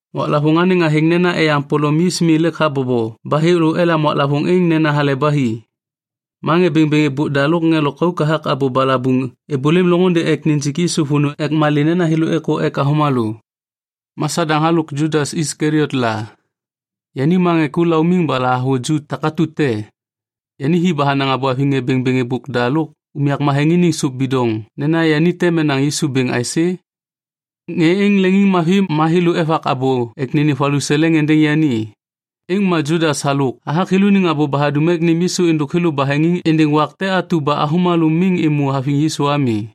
Waklavôŋ anêŋ athêŋ nena Eyaŋ Polom Yis Mi lêk habobo ba thêlô elam waklavôŋ êŋ nena Hale Ba Hi. Ma ŋê bêŋbêŋ êbôk da lôk ŋê lôkauk hathak abô balabuŋ êbôlêm loŋôndê ek nijik Yisu vônô ek malê nena thêlô êkô ek avômalô. Ma Sadaŋ halôk Judas Iskaliot la. Yani ma ŋê ku laumiŋ ba lahavuju takatu te. Yani hi ba hanaŋ abô haviŋ ŋê bêŋbêŋ êbôk da lôk unyak matheŋ iniŋ sôp bidoŋ nena yani tem enaŋ Yisu bêŋ aisê? Ŋê êŋ leŋiŋmavi ma thêlô evak abô ek nênêm valuseleŋ êndêŋ yani. Êŋ ma Judas halôk hathak thêlôniŋ abô ba hadum ek nêm Yisu êndôk thêlô baheŋiŋ êndêŋ wak te atu ba avômalô miŋ êmô haviŋ Yisu ami.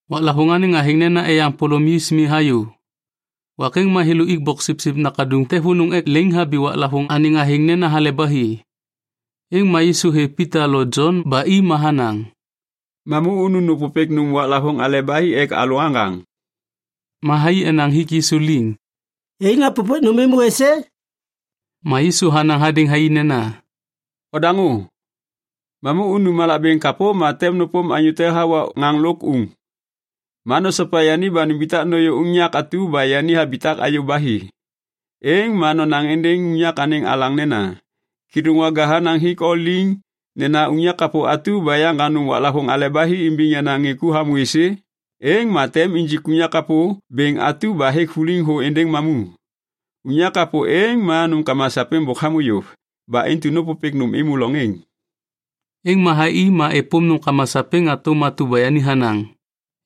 Waklavôŋ anêŋ athêŋ nena Eyaŋ Polom Yis Mi hayô. Wak êŋ ma thêlô ik boksipsip nakaduŋ te vônô ek leŋiŋhabi waklavôŋ anêŋ athêŋ nena Hale ba Hi. Êŋ ma Yisu hêv Pita lo Jon ba i ma hanaŋ, “Mamu unu nôpôpêk nôm waklavôŋ Hale ba Hi ek alalô aŋgaŋ.” Ma thai enaŋ hik Yisu liŋ, “Yai napôpêk nôm êmô êsê?” Ma Yisu hanaŋ hadêŋ thai nena, “Odaŋô. Mamu unu malak bêŋ kapô ma tem nôpôm anyô te hawa ŋaŋ lôk uŋ. Ma nosopa yani ba numbitak nôyô unyak atu ba yani habitak hayô ba hi. Êŋ ma nonaŋ êndêŋ unyak anêŋ alaŋ nena, ‘Kêdôŋwaga hanaŋ hik o liŋ nena unyak kapô atu ba yaŋgaŋ nôm waklavôŋ Hale ba Hi imbiŋ yenaŋ ŋê ku hamô êsê?’ Êŋ ma tem injik unyak kapô bêŋ atu ba hêk vuliŋ thô êndêŋ mamu. Unyak kapô êŋ ma nômkama sapêŋ bôk hamô yôv. Ba intu nôpôpêk nôm êmô loŋ êŋ.” Êŋ ma thai i ma êpôm nômkama sapêŋ hatôm atu ba yani hanaŋ.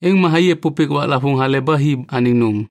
Êŋ ma thai êpôpêk waklavôŋ Hale ba Hi anêŋ nôm.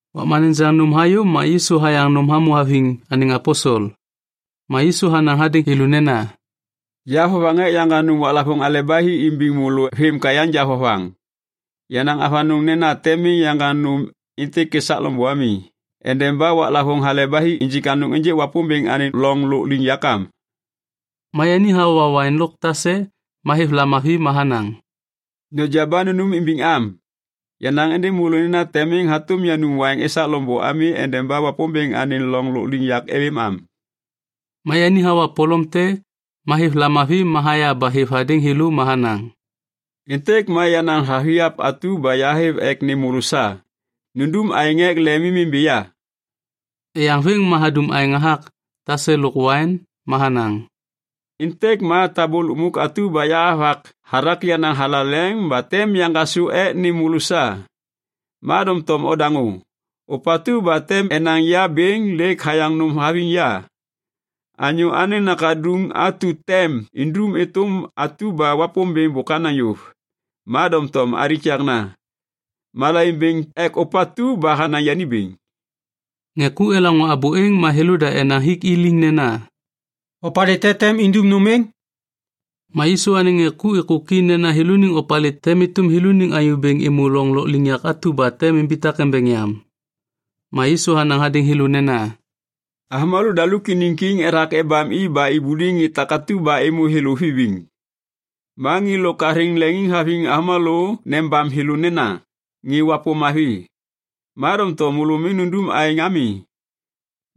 Wakma nejaŋ nôm hayô ma Yisu hayaŋ nôm hamô haviŋ anêŋ aposel. Ma Yisu hanaŋ hadêŋ thêlô nena, “Ya vovaŋ ek yaŋgaŋ nôm waklavôŋ Hale ba Hi imbiŋ môlô vêm ka yanja vovaŋ. Yahanaŋ avanôŋ nena tem miŋ yaŋgaŋ nôm êntêk esak loŋbô ami endeba waklavôŋ Hale ba Hi injik anôŋ ênjêk Wapômbêŋ anêŋ loŋ lôkliŋyak am.” Ma yani hawa waiŋ lôk tase ma hêv lamavi ma hanaŋ, “Noja ba nunum imbiŋ am. Yanaŋ êndêŋ môlô nena tem miŋ hatôm yanum waiŋ esak loŋbô ami endeba Wapômbêŋ anêŋ loŋ lôkliŋyak êlêm am.” Ma yani hawa polom te ma hêv lamavi ma haya ba hêv hadêŋ thêlô ma hanaŋ, “Êntêk ma yenaŋ vathiap atu ba yahêv ek nêm môlô sa. Nundum aêŋ ek lemimimbi ya.” Eyaŋ vêm ma hadum aêŋ hathak tase lôk waiŋ ma hanaŋ, “Êntêk ma tabô lukmuk atu ba yahavak hathak yenaŋ thalaleŋ ba tem yaŋgasô ek nêm môlô sa. Ma doŋtom odaŋô. Ôpatu ba tem enaŋ ya bêŋ lêk hayaŋ nôm haviŋ ya. Anyô Anêŋ Nakaduŋ atu tem indum êtôm atu ba Wapômbêŋ bôk hanaŋ yôv, ma doŋtom alikakna. Malaiŋ bêŋ ek ôpatu ba hanaŋ yani bêŋ.” Ŋê ku elaŋô abô êŋ ma thêlôda enaŋ hik i liŋ nena, “Opalê te tem indum nôm êŋ?” Ma Yisu anêŋ ŋê ku êkôki nena thêlôniŋ opalê tem êtôm thêlôniŋ anyô bêŋ êmô loŋ lôkliŋyak atu ba tem imbitak embeŋ yam. Ma Yisu hanaŋ hadêŋ thêlô nena, “Avômalô daluk iniŋ kiŋ ethak ebam i ba ibuliŋ ŋê takatu ba êmô thêlô vibiŋ. Ma ŋê lôk athêŋ leŋiŋhaviŋ avômalô nebam thêlô nena ‘Ŋê wapôm mavi’. Ma doŋtom môlô miŋ nundum aêŋ ami.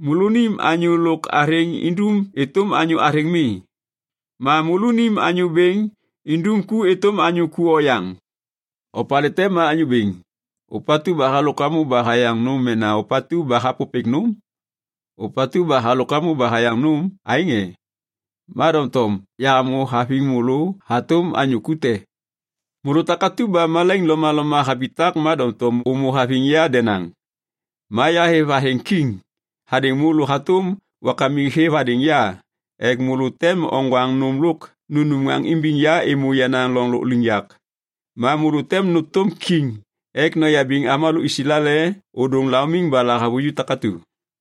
Môlônim anyô lôk athêŋ indum êtôm anyô athêŋ mi. Ma môlônim anyô bêŋ indum ku êtôm anyô ku oyaŋ. Opalê te ma anyô bêŋ, ôpatu ba halôk hamô ba hayaŋ nôm mena ôpatu ba hapôpêk nôm? Ôpatu ba halôk hamô ba hayaŋ nôm, aêŋ e? Ma doŋtom yahamô haviŋ môlô hatôm anyô ku te. “Môlô takatu ba malaiŋ lomaloma habitak ma doŋtom ômô haviŋ ya denaŋ. Ma yahêv athêŋ ‘kiŋ’ hadêŋ môlô hatôm wakamik hêv hadêŋ ya ek môlô tem oŋgwaŋ nôm lôk nunum ŋaŋ imbiŋ ya êmô yenaŋ loŋ lôkliŋyak. Ma môlô tem nôtôm kiŋ ek noyabiŋ avômalô Islael ôdôŋ laumiŋ ba lahavuju takatu.”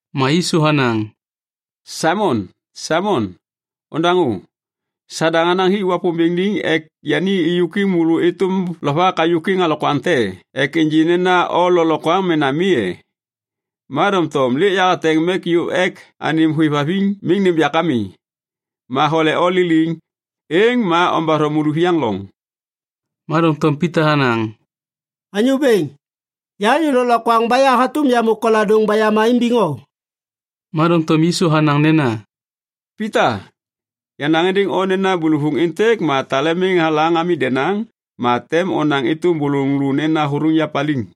Ma Yisu hanaŋ, “Saimon, Saimon, ondaŋô. Sadaŋ hanaŋ hik Wapômbêŋ liŋ ek yani êyôkwiŋ môlô êtôm lovak hayôkwiŋ alokwaŋ te ek ênjê nena o lôklokwaŋ mena mi e? Ma doŋtom lêk yahateŋ mek yôv ek anêm hôêvhaviŋ miŋ nêm yak ami. Ma hole o liliŋ, êŋ ma ombatho môlôviyaŋ loŋ.” Ma doŋtom Pita hanaŋ, “Anyô Bêŋ, ya anyô lôklokwaŋ ba ya hatôm yamô koladôŋ ba yama imbiŋ o.” Ma doŋtom Yisu hanaŋ nena, “Pita, yanaŋ êndêŋ o nena bôlôvôŋ êntêk ma tale miŋ halaŋ ami denaŋ, ma tem onaŋ êtôm bôlôŋ lô nena hôthôŋ ya paliŋ.”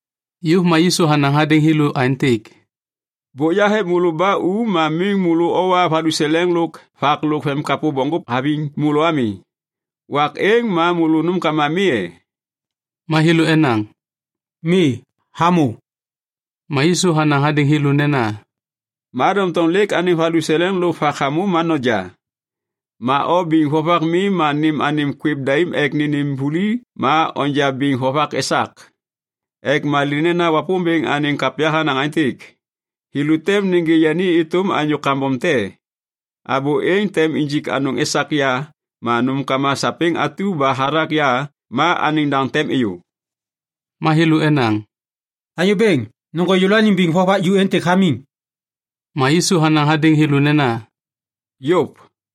Yôv ma Yisu hanaŋ hadêŋ thêlô aêntêk, “Bôk yahêv môlô ba u ma miŋ môlô owa valuseleŋ lôk vak lôk vemimkapô bokŋgôp haviŋ môlô ami. Wak êŋ ma môlô nômkama mi e?” Ma thêlô enaŋ, “Mi, hamô.” Ma Yisu hanaŋ hadêŋ thêlô nena, “Ma doŋtom lêk anêm valuseleŋ lôk vak hamô ma noja. Ma o biŋ vovak mi, ma nêm anêm kwêv daim ek nênêm vuli ma onja biŋ vovak esak. Ek malê nena Wapômbêŋ anêŋ kapya hanaŋ aêntêk, ‘Thêlô tem nêgê yani êtôm anyô kambom te.’ Abô êŋ tem injik anôŋ esak ya ma nômkama sapêŋ atu ba hathak ya ma anêŋ daŋ tem êyô.” Ma thêlô enaŋ, “Anyô Bêŋ, nôŋgô yêlôaniŋ biŋ vovak ju êntêk hamiŋ.” Ma Yisu hanaŋ hadêŋ thêlô nena, “Yôv.”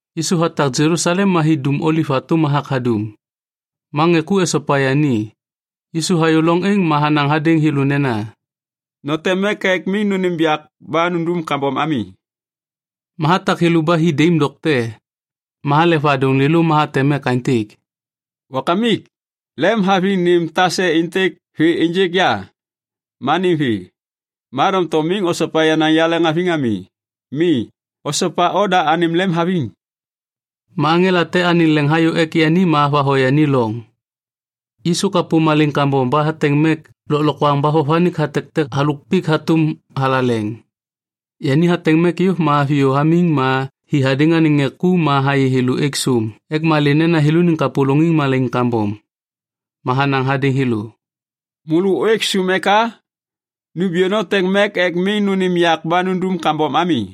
Yisu hatak Jelusalem ma hi Dum Oliv hatôm hathak hadum, ma ŋê ku esopa yani. Yisu hayô loŋ êŋ ma hanaŋ hadêŋ thêlô nena, “Noteŋ mek ek miŋ nônêm yak ba nundum kambom ami.” Ma hatak thêlô ba hi daim dokte. Ma halek vadôŋ lêlô ma hateŋ mek aêntêk, “Wakamik, lemhaviŋ nêm tase êntêk vê ênjêk ya, ma nêm vê. Ma doŋtom miŋ osopa yenaŋ yaleŋhaviŋ ami. Mi, osopa oda anêm lemhaviŋ.” Ma aŋela te anêŋ leŋ hayô ek yani ma havatho yani loŋ. Yisu kapô malaiŋ kambom ba hateŋ mek lôklokwaŋ ba vovanik hatektek halôk pik hatôm thalaleŋ. Yani hateŋ mek yôv ma haviyô hamiŋ ma hi hadêŋ anêŋ ŋê ku ma hayê thêlô êk sôm ek malê nena thêlôniŋ kapôlôŋiŋ malaiŋ kambom. Ma hanaŋ hadêŋ thêlô, “Môlô ôêk sôm eka? Numbiyô noteŋ mek ek miŋ nônêm yak ba nundum kambom ami.”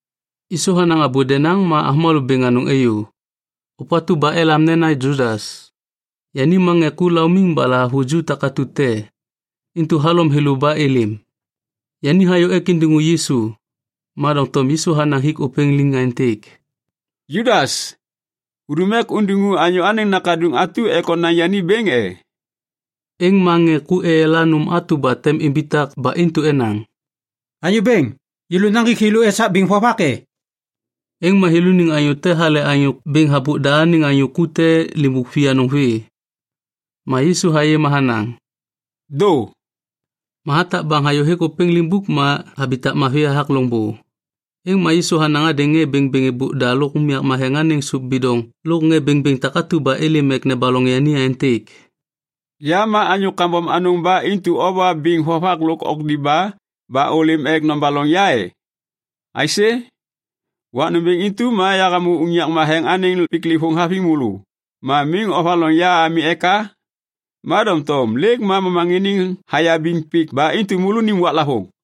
Yisu hanaŋ abô denaŋ ma avômalô bêŋ anôŋ êyô. Ôpatu ba elam nena Judas, yani ma ŋê ku laumiŋ ba lahavuju takatu te, intu halom thêlô ba êlêm. Yani hayô ek indiŋu Yisu, ma doŋtom Yisu hanaŋ hik ôpêŋ liŋ aêntêk, “Judas, hudum ek undiŋu Anyô Anêŋ Nakaduŋ atu ek onaŋ yani bêŋ e?” Êŋ ma ŋê ku eyala nôm atu ba tem imbitak ba intu enaŋ, “Anyô Bêŋ, yêlô naŋgik thêlô esak biŋ vovak e?” Êŋ ma thêlôniŋ anyô te hale anyô bêŋ habôk da anêŋ anyô ku te limbuk vianôŋ vê. Ma Yisu hayê ma hanaŋ, “Dô.” Ma hatak baŋ hayôhêk ôpêŋ limbuk ma habitak mavi hathak loŋbô. Êŋ ma Yisu hanaŋ hadêŋ ŋê bêŋbêŋ êbôk da lôk unyak matheŋ iniŋ sôp bidoŋ lôk ŋê bêŋbêŋ takatu ba êlêm ek nebaloŋ yani aêntêk, “Ya ma anyô kambom anôŋ ba intu owa biŋ vovak lôk okdiba ba ôlêm ek nobaloŋ ya e? Aisê? Wak nômbêŋ intu ma yahamô unyak matheŋ anêŋ piklêvôŋ haviŋ môlô ma miŋ ovaloŋ ya ami eka? Ma doŋtom lêk ma momaŋiniŋ hayabiŋ pik ba intu môlônim waklavôŋ.”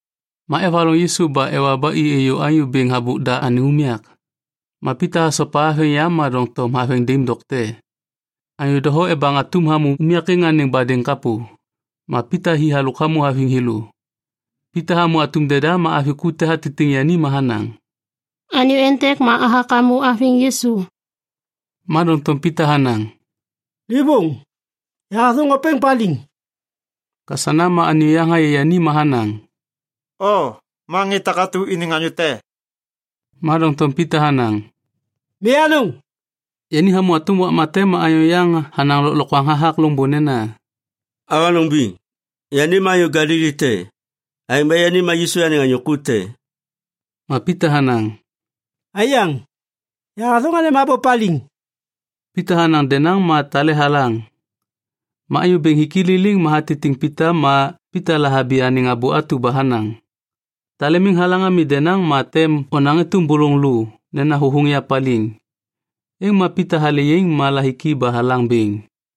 Ma evaloŋ Yisu ba ewa ba i êyô anyô bêŋ habôk da anêŋ unyak. Ma Pita hasopa haveŋ yam ma doŋtom haveŋ daim dokte. Anyô doho ebaŋ atum hamô unyak êŋ anêŋ badêŋ kapô, ma Pita hi halôk hamô haviŋ thêlô. Pita hamô atum deda ma avi ku te hatitiŋ yani ma hanaŋ, “Anyô êntêk ma hathak hamô haviŋ Yisu.” Ma doŋtom Pita hanaŋ, “Livôŋ, yahathôŋ ôpêŋ paliŋ.” Kasana ma anyô yaŋ hayê yani ma hanaŋ, “O ma ŋê takatu iniŋ anyô te.” Ma doŋtom Pita hanaŋ, “Mi anôŋ.” Yani hamô hatôm wakma te ma anyô yaŋ hanaŋ lôklokwaŋ hathak loŋbô nena, “Avanôŋ biŋ, yani ma anyô Galili te. Aêŋ ba yani ma Yisu anêŋ anyô ku te.” Ma Pita hanaŋ, “Aiyaŋ, yahathôŋ anêm abô paliŋ!” Pita hanaŋ denaŋ ma tale halaŋ. Ma Anyô Bêŋ hik i liliŋ ma hatitiŋ Pita ma Pita lahabi anêŋ abô atu ba hanaŋ, “Tale miŋ halaŋ ami denaŋ ma tem onaŋ êtôm bôlôŋ lô nena hôthôŋ ya paliŋ.” Êŋ ma Pita hale yaiŋ ma lahiki ba halaŋ bêŋ.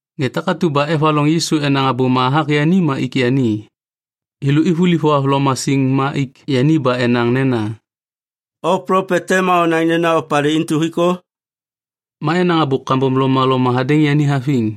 Ŋê takatu ba evaloŋ Yisu enaŋ abôma hathak yani ma ik yani. Thêlô ivuliv thohavloma siŋ ma ik yani ba enaŋ nena, “O plopet te ma onaŋ nena opalê intu hik o?” Ma enaŋ abô kambom lomaloma hadêŋ yani haviŋ.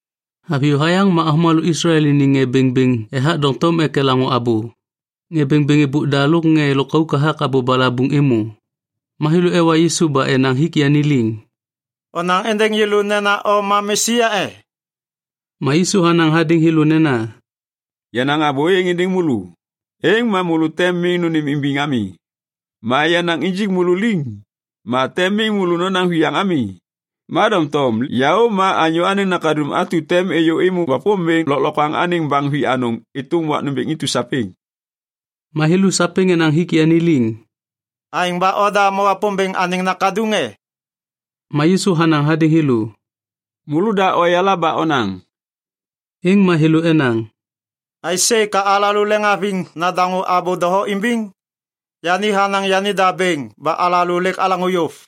Haviyô hayaŋ ma avômalô Islael iniŋ ŋê bêŋbêŋ ethak doŋtom ek elaŋô abô. Ŋê bêŋbêŋ êbôk da lôk ŋê lôkauk hathak abô balabuŋ êmô. Ma thêlô ewa Yisu ba enaŋ hik yani liŋ, “Onaŋ êndêŋ yêlô nena o ma Mesia e?” Ma Yisu hanaŋ hadêŋ thêlô nena, “Yanaŋ abô êŋ êndêŋ môlô, êŋ ma môlô tem miŋ nônêmimbiŋ ami. Ma yanaŋ injik môlô liŋ, ma tem miŋ môlô nonaŋ viyaŋ ami. Ma doŋtom yaô ma Anyô Anêŋ Nakaduŋ atu tem êyô êmô Wapômbêŋ lôklokwaŋ anêŋ baŋ vianôŋ êtôm wak nômbêŋ intu sapêŋ.” Ma thêlô sapêŋ enaŋ hik yani liŋ, “Aêŋ ba oda ma Wapômbêŋ anêŋ Nakaduŋ e?” Ma Yisu hanaŋ hadêŋ thêlô, “Môlôda oyala ba onaŋ.” Êŋ ma thêlô enaŋ, “Aisê ka alalô leŋiŋhaviŋ nadaŋô abô doho imbiŋ? Yani hanaŋ yanida bêŋ ba alalô lêk alaŋô yôv.”